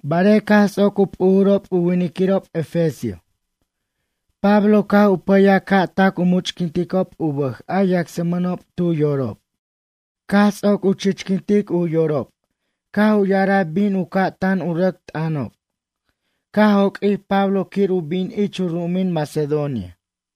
Barej caj ts'oc u p'ujurob u winiquirob efesio. Pablo caj u pʌyaj ca' tac u much'quinticob u bʌj a yacsmʌnob tu yorob. Caj ts'oc u chichquintic u yorob caj u ya'araj bin u ca' tan u rʌc t'ʌnanob, caj joq'uij Pablo quir u bin ich u ru'umin Macedonia.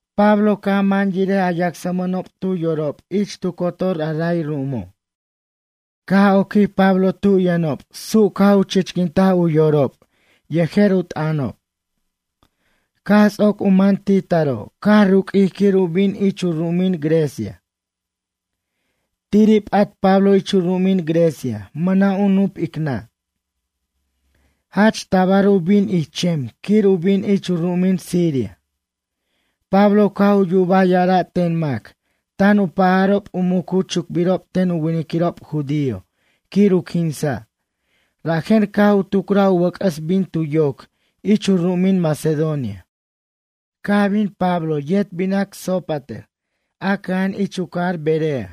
Pablo caj man yirej a yacsmʌnob tu yorob ich tu cotor a ray ru'umo'. Caj oquij Pablo tu yʌnob su' caj u chichquintaj u yorob yejer u t'ʌnob. Caj ts'oc u man ti taro' caj ruq'uij quir u bin ich u ru'umin Grecia. Tiri' p'at Pablo ich u ru'umin Grecia mʌna' u nup ic nʌ'. Jach tabar u bin ich chem quir u bin ich u ru'umin Siria. Pablo caj u yubaj ya'ara' ten mac tan u pajarob u mucu chucbirob ten u winiquirob judío quir u quinsa', rajen caj u tucraj u wʌc'ʌs bin tu yoc ich u ru'umin Macedonia. Caj bin Pablo yet binac Sópater a cʌja'an ich u cajar Berea.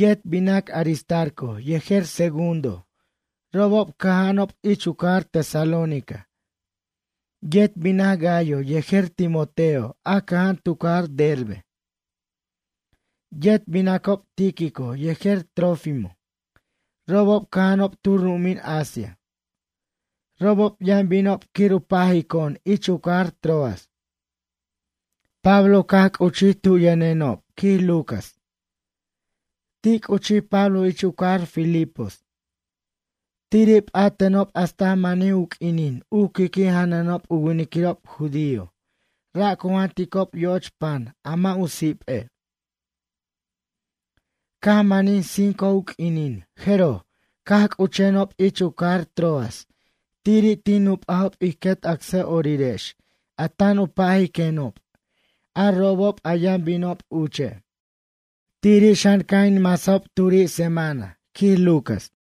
Yet binac Aristarco yejer Segundo, robob cʌja'anob ich u cajar Tesalónica. Yet binac Gayo yejer Timoteo a cʌja'an tu cajar Derbe. Yet binacob Tíquico yejer Trófimo, robob cʌja'anob tu ru'umin Asia. Robob yʌn binob quir u pajico'on ich u cajar Troas. Pablo caj c'uchij tu yʌnenob, quij Lucas. Ti' c'uchij Pablo ich u cajar Filipos. Tiri' p'atenob hasta manij u q'uinin u qui'qui' janʌnob u winiquirob judío, ra' cu janticob yo'och pan a mʌ' u sip'e'. Caj manij cinco u q'uinin jeroj, caj c'uchenob ich u cajar Troas tiri' tin nup'ajob ij quet acsa'orirex a tan u pajiquenob, a robob a yʌn binob uche'. Tiri' xan caj in masajob turi semana, quij Lucas.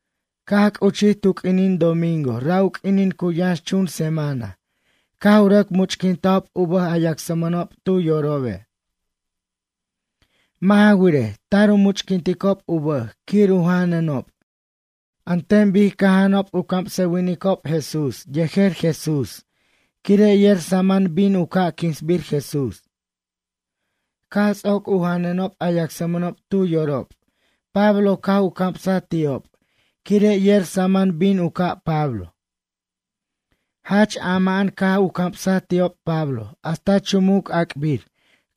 Caj c'uchij tu q'uinin domingo ra' u q'uinin cu yʌnxchun semana caj u rʌc much'quintajob u bʌj a yacsmʌnob tu yorobe'. Mʌ' ja wirej, tar u much'quinticob u bʌj quir u janʌnob an ten bic caj janʌnob u camsʌwinicob Jesús yejer Jesús quire' yer saman bin u ca' quinsbir Jesús. Caj ts'oc u janʌnob a yacsmʌnob tu yorob Pablo caj u camsaj ti'ob quire' yer saman bin u ca' Pablo. Jach ama'an caj u camsaj ti'ob Pablo hasta chumuc ac'bir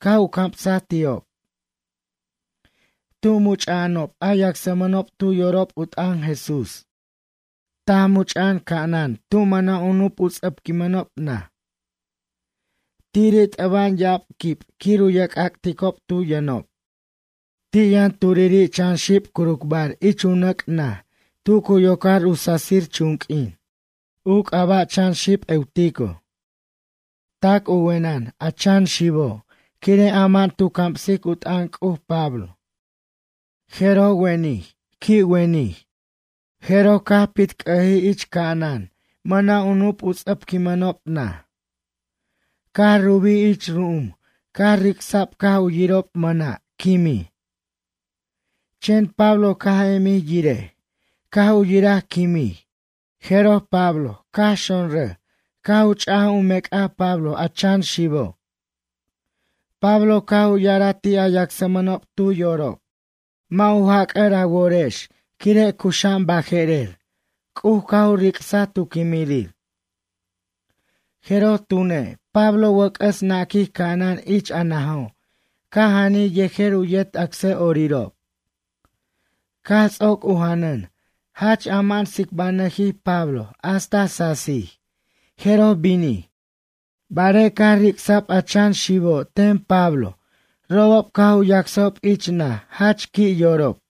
caj u camsaj ti'ob. Tu much'a'anob a yacsmʌnob tu yorob u t'ʌn Jesús taj much'a'an ca'anan tu mʌna' u nup u ts'ʌpquinmʌnob naj. Tiri' t'ʌba'an ya'ab quib quir u ye'c'ac'ticob tu yʌnob. Ti' yʌn turiri' chan xib curucbar ich u nʌc' naj tu cu yocar u sasir chunq'uin. U c'aba' chan xib Eutico. Tac u wenʌn, a chan xibo', quire' ama'an tu camsic u t'ʌn C'uj Pablo. Jeroj wenij, qui' wenij, jeroj caj pitc'ʌjij ich ca'anan mʌna' u nup u ts'ʌpquinmʌnob naj. Caj rubij ich ru'um, caj ric'sa'b caj u yirob mʌna', quimij. Chen Pablo caj emij yirej. Caj u yiraj quimij. Jeroj Pablo caj xonrʌj, caj u ch'aj u mec'aj Pablo a chan xibo'. Pablo caj u ya'araj ti' a yacsmʌnob tu yorob: ―Mʌ' u jac'ʌr a worex, quire' cuxa'an baje'rer, C'uj caj u ric'saj tu quimirir. Jeroj tune', Pablo wʌc'ʌs naquij ca'anan ich a najo' caj janij yejer u yet acsa'orirob. Caj ts'oc u janʌn, jach ama'an tsicbanʌjij Pablo hasta sasij, jeroj binij. Barej caj ric'sa'b a chan xibo' ten Pablo robob caj u yacsajob ich naj, jach qui' yorob.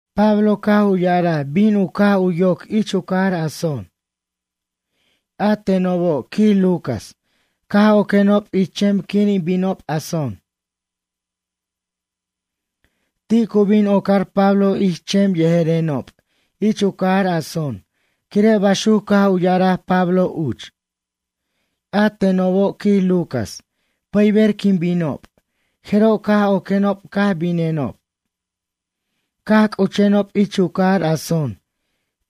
Pablo caj u ya'araj bin u caj u yoc ich u cajar Asón. A tenobo', quij Lucas, caj oquenob ich chem quir in binob Asón. Ti' cu bin ocar Pablo ich chem yejerenob, ich u cajar Asón quire' baxuc caj u ya'araj Pablo uch. A tenobo', quij Lucas, pʌyber quin binob, jeroj caj oquenob caj binenob. Caj c'uchenob ich u cajar Asón.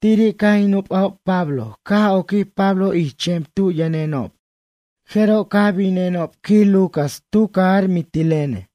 Tiri' caj in nup'ajob Pablo caj oquij Pablo ich chem tu yʌnenob, jeroj caj binenob, quij Lucas, tu cajar Mitilene.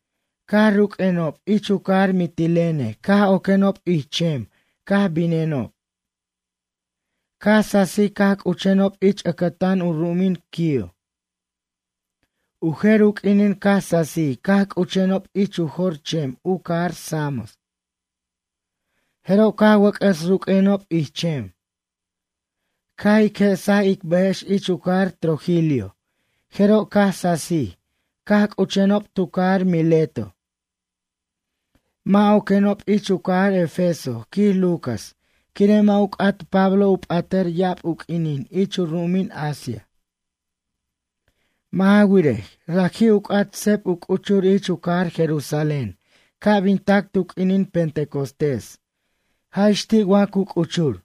Caj ruq'uenob, ich u cajar Mitilene caj oquenob ich chem caj binenob. Caj sasij caj c'uchenob ich ʌcʌtan u ru'umin Quío. U jer u q'uinin caj sasij caj c'uchenob ich u jor chem u cajar Samos. Jeroj caj wʌc'ʌs ru'q'uenob ich chem. Caj ic je'saj ic bʌjex ich u cajar Trogilio, jeroj, caj sasij caj c'uchenob tu cajar Mileto. Mʌ' oquenob ich u cajar Efeso, quij Lucas, quire' mʌ' u c'at Pablo u p'atʌr ya'ab u q'uinin ich u ru'umin Asia. Mʌ' ja wirej, raji' u c'at seb u c'uchur ich u cajar Jerusalén ca' bin tac tu q'uinin Pentecostés, jaj ix ti' wa cu c'uchur.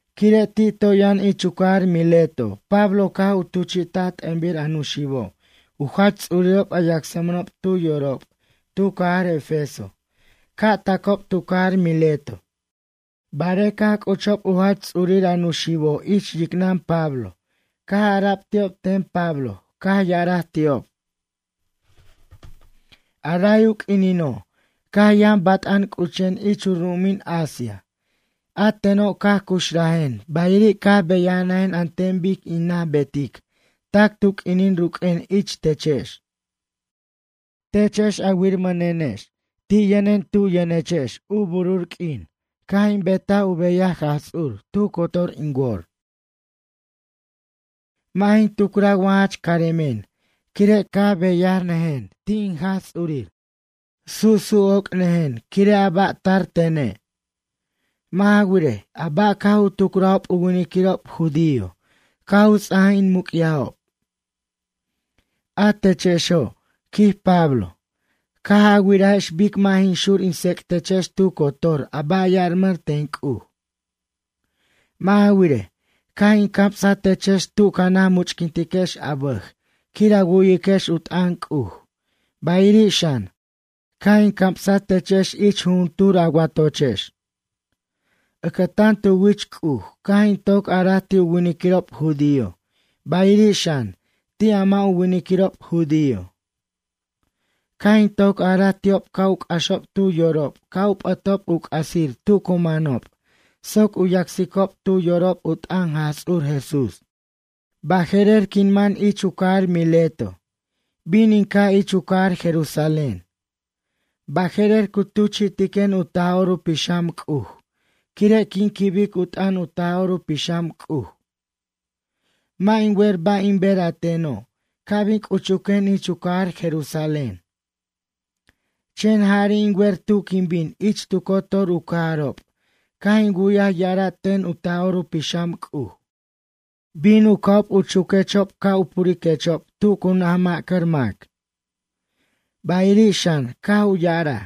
Quire' ti' toy yʌn ich u cajar Mileto, Pablo caj u tuchi'taj t'ʌnbir a nuxibobo' u jach ts'urirob a yacsmʌnob tu yorob tu cajar Efeso ca' tacob tu cajar Mileto. Barej caj c'uchob u jach ts'urir a nuxibobo' ich yicnʌn Pablo, caj ara'b ti'ob ten Pablo caj ya'araj ti'ob: ―A ray u q'uinino' caj yʌn bat'an c'uchen ich u ru'umin Asia, a teno' caj cuxrajen bayiri' caj beyanʌjen an ten bic in naj betic tac tu q'uinin ruq'uen ich techex. Techex a wirmʌnenex ti' yʌnen tu yʌnechex u burur q'uin caj in betaj u beyaj Jaj Ts'ur tu cotor in wor. Mʌ' jin tucraj wa jach caremen, quire' caj beyanʌjen ti' in Jaj Ts'urir. Susu' oc'nʌjen quire' a ba' tar tene'. Mʌ' ja wirej, a ba' caj u tucrajob u winiquirob judío caj u ts'aj in muc'yajob. A techexo' ―quij Pablo―, caj a wirajex bic mʌ' jin xur in tsec'techex tu cotor a ba' ya'armʌn ten C'uj. Mʌ' ja wirej, caj in camsaj techex tu ca naj much'quintiquex a bʌj quir a wu'yiquex u t'ʌn C'uj, bayiri' xan, caj in camsaj techex ich jujuntur a watochex. Ʌcʌtan tu wich C'uj, caj in toc araj ti' u winiquirob judío bayiri' xan, ti' a mʌ' u winiquirob judío. Caj in toc araj ti'ob ca' u c'axob tu yorob ca' u p'ʌtob u c'asir tu cu manob soc u yacsicob tu yorob u t'ʌn Jaj Ts'ur Jesús. Baje'rer quin man ich u cajar Mileto. Bin in ca' ich u cajar Jerusalén. Baje'rer cu tuchi'tiquen u Taj'or u Pixam C'uj, quire' quin quibic u t'ʌn u Taj'or u Pixam C'uj. Mʌ' in wer ba' in ber a teno' ca' bin c'uchuquen ich u cajar Jerusalén. Chen jari' in wer tu quin bin ich tu cotor u cajarob caj in wu'yaj ya'ara' ten u Taj'or u Pixam C'uj: Bin u ca'ob u chuquechob ca' u puriquechob tu cu naj ma'cʌr mac. Bayiri' xan, caj u ya'araj: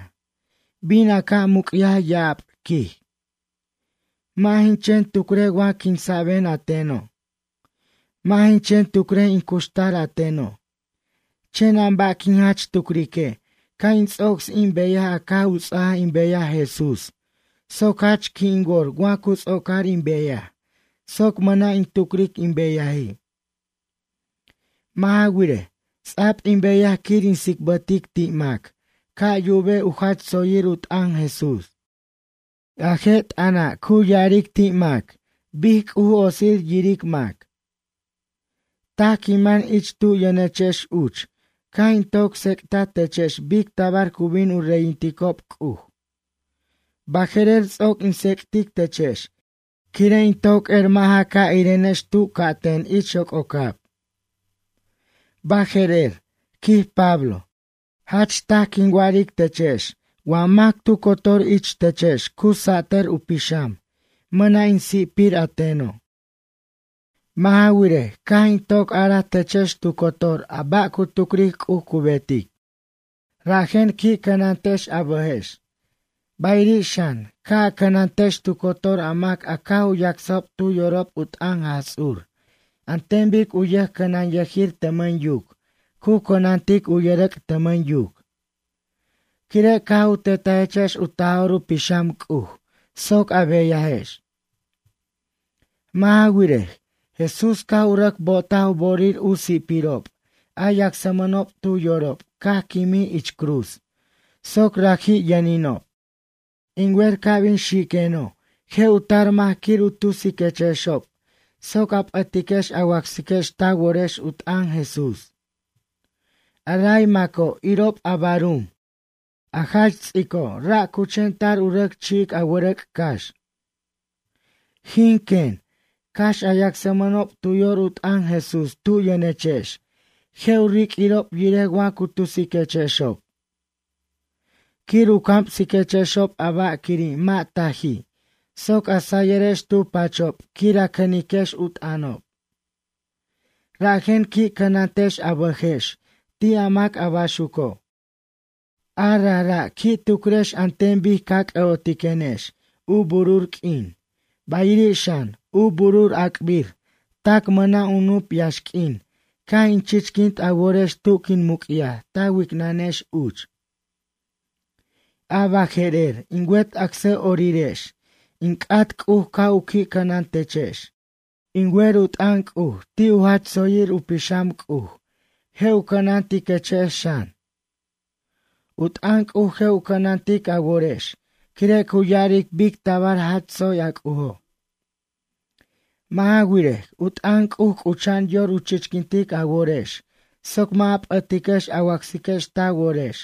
Bin a ca' muc'yaj ya'ab, quij. Mʌ' jin chen tucrej wa quinsa'ben a teno'. Mʌ' jin chen tucrej in cuxtar a teno'. Chen a ba' quin jach tucrique', ca' in ts'ocs in beyaj a caj u ts'aj in beyaj Jesús soc jach qui' in wor wa cu ts'ocar in beyaj soc mʌna' in tucric in beyaji'. Mʌ' ja wirej, ts'a'b in beyaj quir in tsicbʌtic ti' mac, ca' yubej u jach tsoyir u t'ʌn Jesús. A je' t'ʌna' cu ya'aric ti' mac bic C'uj otsir yiric mac. ’Taj quin man ich tu yʌnechex uch caj in toc tsec'taj techex bic tabar cu bin u reyinticob C'uj. Baje'rer ts'oc in tsec'tic techex, quire' in toc er mʌ' ja ca' irenex tu ca'ten ich yoc'ocab. Baje'rer ―quij Pablo―, jach taj quin wa'aric techex wa mac tu cotor ich techex cu satʌr u pixam, mʌna' in si'pir a teno'. Mʌ' ja wirej, caj in toc araj techex tu cotor a ba' cu tucric C'uj cu betic. Rajen qui' cʌnantex a bʌjex. Bayiri' xan, ca' a cʌnantex tu cotor a mac a caj u yacsajob tu yorob u t'ʌn Jaj Ts'ur an ten bic u yʌjcʌnanyʌjir tʌmʌn yuc cu cʌnantic u yʌrʌc' tʌmʌn yuc. Quire' caj u tetajechex u Taj'or u Pixam C'uj soc a beyajex. Mʌ' ja wirej, Jesús caj u rʌc bo'otaj u bo'orir u si'pirob a yacsmʌnob tu yorob caj quimij ich cruz, soc raji' yʌninob. In wer ca' bin xiqueno' je' u tar mac quir u tusiquechexob soc a p'ʌtiquex a wacsiquex ta worex u t'ʌn Jesús. A ray maco', irob a barum, a jach ts'ico', ra' cu chen tar u rʌc chi'ic a wʌrʌc' cax. Jin, quen, cax a yacsmʌnob tu yor u t'ʌn Jesús tu yʌnechex, je' u riq'uirob yirej wa cu tusiquechexob. Quir u camsiquechexob a ba' quiri' mʌ' taji' soc a sayʌrex tu pachob quir a cʌniquex u t'ʌnob. Rajen qui' cʌnantex a bʌjex ti' a mac a baxuco'. A rajra' qui' tucrex an ten bic ca c'ʌ'otiquenex u burur q'uin, bayiri' xan, u burur ac'bir tac mʌna' u nup yaxq'uin caj in chichquint a worex tu quin muc'yaj ta wicnʌnex uch. ’A baje'rer, in wet acsa'orirex, in c'at C'uj ca' u qui' cʌnan techex. In wer u t'ʌn C'uj ti' u jach tsoyir u pixam C'uj je' u cʌnantiquechex xan. U t'ʌn C'uj je' u cʌnantic a worex quire' cu ya'aric bic tabar jach tsoy a C'ujo'. Mʌ' ja wirej, u t'ʌn C'uj c'ucha'an yor u chichquintic a worex, soc mʌ' a p'ʌtiquex a wacsiquex ta worex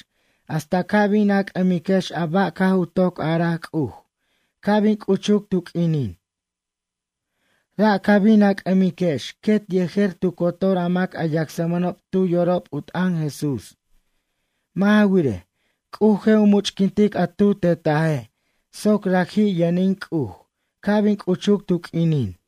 hasta ca' bin a c'ʌmiquex a ba' caj u toc araj C'uj ca' bin c'uchuc tu q'uinin. Ra' ca bin a c'ʌmiquex quet yejer tu cotor a mac a yacsmʌnob tu yorob u t'ʌn Jesús. Mʌ' ja wirej, C'uj je' u much'quintic a tu tetaje' soc raji' yʌnin C'uj, ca' bin c'uchuc tu q'uinin.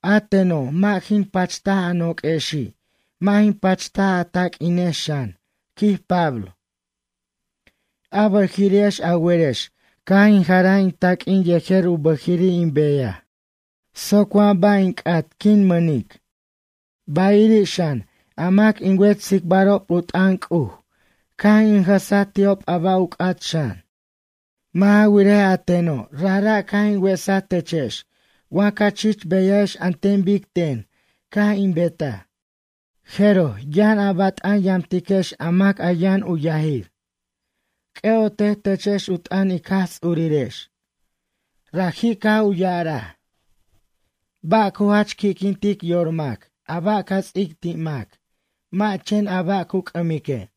A teno', mʌ' jin pachtaj a noq'uexi', mʌ' jin pachtaj a taq'uinex xan ―quij Pablo―. A bʌjiri'ex a werex caj in jaraj in taq'uin yejer u bʌjiri' in beyaj soc wa ba' in c'at quin mʌnic. Bayiri' xan, a mac in wet tsicbarob u t'ʌn C'uj, caj in jʌsaj ti'ob a ba' u c'at xan. Mʌ' ja wirej, a teno' rajra' caj in wesaj techex wa ca chich beyajex an ten bic ten caj in betaj, jeroj, yʌn a bat'an yamtiquex a mac a yʌn u yajir. C'ʌ'otej techex u t'ʌn ic Jaj Ts'urirex. Raji' caj u ya'araj: “Ba' cu jach qui'quintic yor mac, a ba' ca ts'ic ti' mac, mʌ' chen a ba' cu c'ʌmique'.”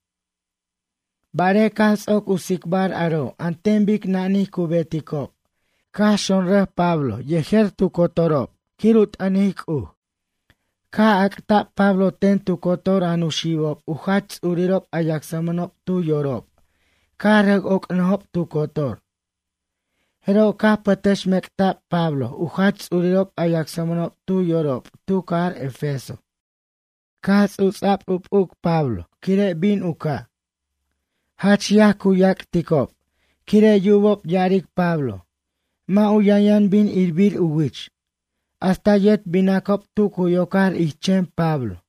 Barej caj ts'oc u tsicbar aro' an ten bic nanij cu beticob, caj xonrʌj Pablo yejer tu cotorob quir u t'ʌnic C'uj. Caj ac'ta'b Pablo ten tu cotor a nuxibob u jach ts'urirob a yacsmʌnob tu yorob, caj rʌc oc'nʌjob tu cotor. Jeroj caj u pʌtʌxmec'ta'b Pablo u jach ts'urirob a yacsmʌnob tu yorob tu cajar Efeso. Caj ts'uts'a'b u p'uc Pablo, quire' bin u ca'. Jach yaj cu yac'ticob, quire' yubob ya'aric Pablo. Mʌ' u yʌnyʌn bin irbir u wich. Hasta yet binacob tu cu yocar ich chem Pablo.